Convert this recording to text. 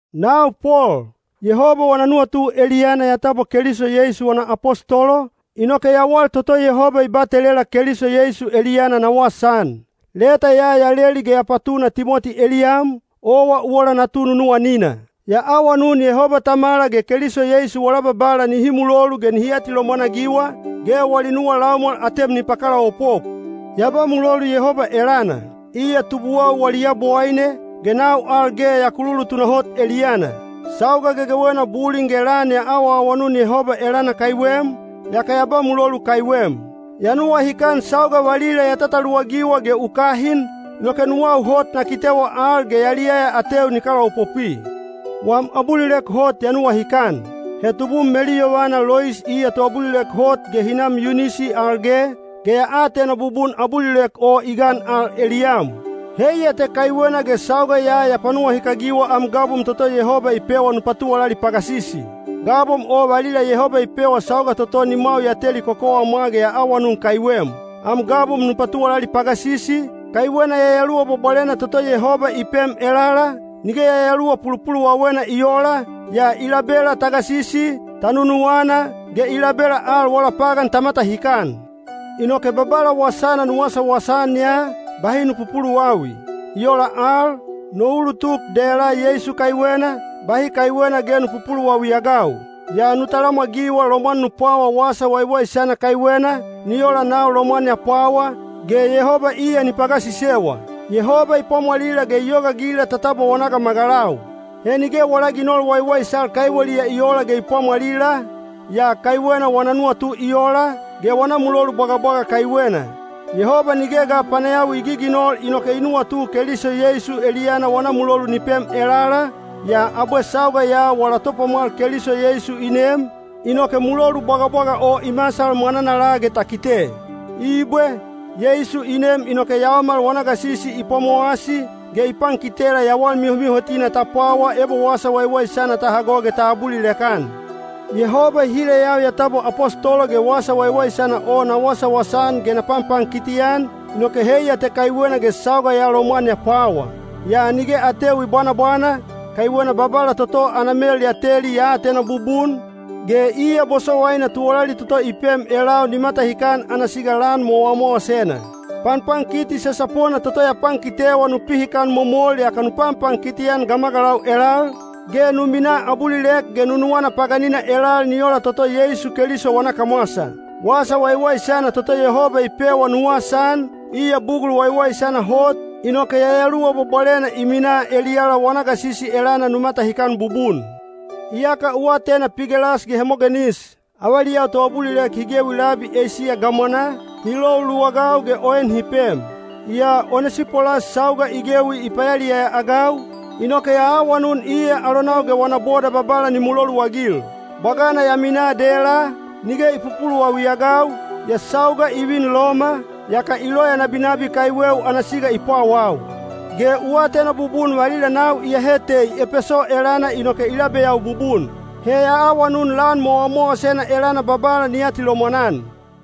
Nau Pol, Yehoba wana nuwatu eliyana ya tabwa Keliso Yeisu wana apostolo, inoke yawal toto Yehoba i batelela Keliso Yeisu eliyana na wasaan. Leta ya ya leli ge ya patuna Timoti eliyam, owa u ola natu nunuwanina. Ya awanun Yehoba Tamala ge Keliso Yeisu wala Babala nihi mulolu ge nihi atilomwan-agiwa, ge wali nuwa laumwal atem ni pakalaopop. Ya ba mulolu Yehoba elana, iya tubuwau wali Yabowaine, ge nau al ge ya kululu tunahot eliyana. Sauga gegewena bulin ge lan ya awaawanun Yehoba elana kaiwem, yaka ya ba mulolu kaiwem. Ya nuwahikan sauga valila ya tataluwagiwa ge u kahin, inoke nuwau hot na kitewa al ge yaliyaya ateu ni kalaopopwi. Wam abulilek hot ya nuwahikan. He tubum meluyovana Lois iya toabulilek hot ge hinam Yunisi al ge, ge ya atena bubun abulilek o i gan al eliyam. Heiya te kaiwena ge sauga ya ya panuwahikagiwa am gabom toto Yehoba i pewa nu patuwalali pagasisi. Gabom o valila Yehoba i pewa sauga toto nimwau ya teli kokowamwa ge ya awanun kaiwem. Am gabom nu patuwalali pagasisi, kaiwena Yayaluwa Bwabwalena toto Yehoba i pem elala, nige yayaluwa pulupuluwawena i oola, yaa i labela ta gasisi, ta nunuwana, ge i labela al wala pagan ta matahikan. Inoke Babala wasana nu wasawasa-an ya, bahi nu pupuluwawi. I ola al, no ulutuk dela Yeisu kaiwena, bahi kaiwena ge nu pupuluwawi-agau. Yaa nu talamwagiwa lomwan nu pwawa Wasa Waiwaisana kaiwena, ni ola nau lomwan ya pwawa, ge Yehoba iya ni pagasisewa. Yehoba i pwamwalila ge i yogaagila ta tabwa wana gamagalau. He nige wala ginol waiwaisal kaiweliya i oola ge i pwamwalila, yaa kaiwena wana nuwatu i ola, ge wana mulolu bwagabwaga kaiwena. Yehoba nige ga panayawi i giginol inoke i nuwatu Keliso Yeisu eliyana wana mulolu ni pem elala, yaa abwe sauga ya wala Topwamwal Keliso Yeisu i nem, inoke mulolu bwagabwaga o i masal mwananala ge ta kite. Ibwe, Yeisu i nem inoke yaomal wana gasisi i pwamowasi, ge i pankitela yawal mihomihotina ta pwawa ebo Wasa Waiwaisana ta hago ge ta abulilek-an. Yehoba i hileyau ya tabwa apostolo ge Wasa Waiwaisana o na wasawasa-an ge na panpankiti-an, inoke heiya te kaiwena ge sauga ya lomwan ya pwawa. Yaa nige ateu i bwanabwana, kaiwena Babala toto ana mel ya teli ya atena bubun, ge iya bosowaina tuwalali toto i pem elau ni matahikan ana siga lan mowamowasena. Panpankiti sasapona toto ya pankitewa nu pihikan momol yaka nu panpankiti-an gamagalau elal, ge nu minaa abulilek ge nunuwana paganina elal ni ola toto Yeisu Keliso wana kamwasa. Wasa Waiwaisana toto Yehoba i pewa nu wasaan, iya bugul waiwaisana hot, inoke Yayaluwa Bwabwalena i minaa eliyala wana gasisi elana nu matahikan bubun. Iyaka u atena Pigelas ge Hemogenis, avaliyau toabulilek hi gewi labi Eisiya gamwanaa, hi lou luwagau ge o en hi pem. Yaa Onesipolas sauga i gewi i payaliyaya-agau, inoke ya awanun iya alonau ge wana boda Babala ni muloluagil. Bwagana ya minaa dela, nige i pupuluwawi-agau, yaa sauga i vin Loma, yaka i loya nabinabi kaiweu ana siga i pwawau. Ge u atena bubun valila nau iyahe tei Epeso elana inoke i labeyau bubun. He ya awanun lan mowamowasena elana Babala ni atilomwan-an.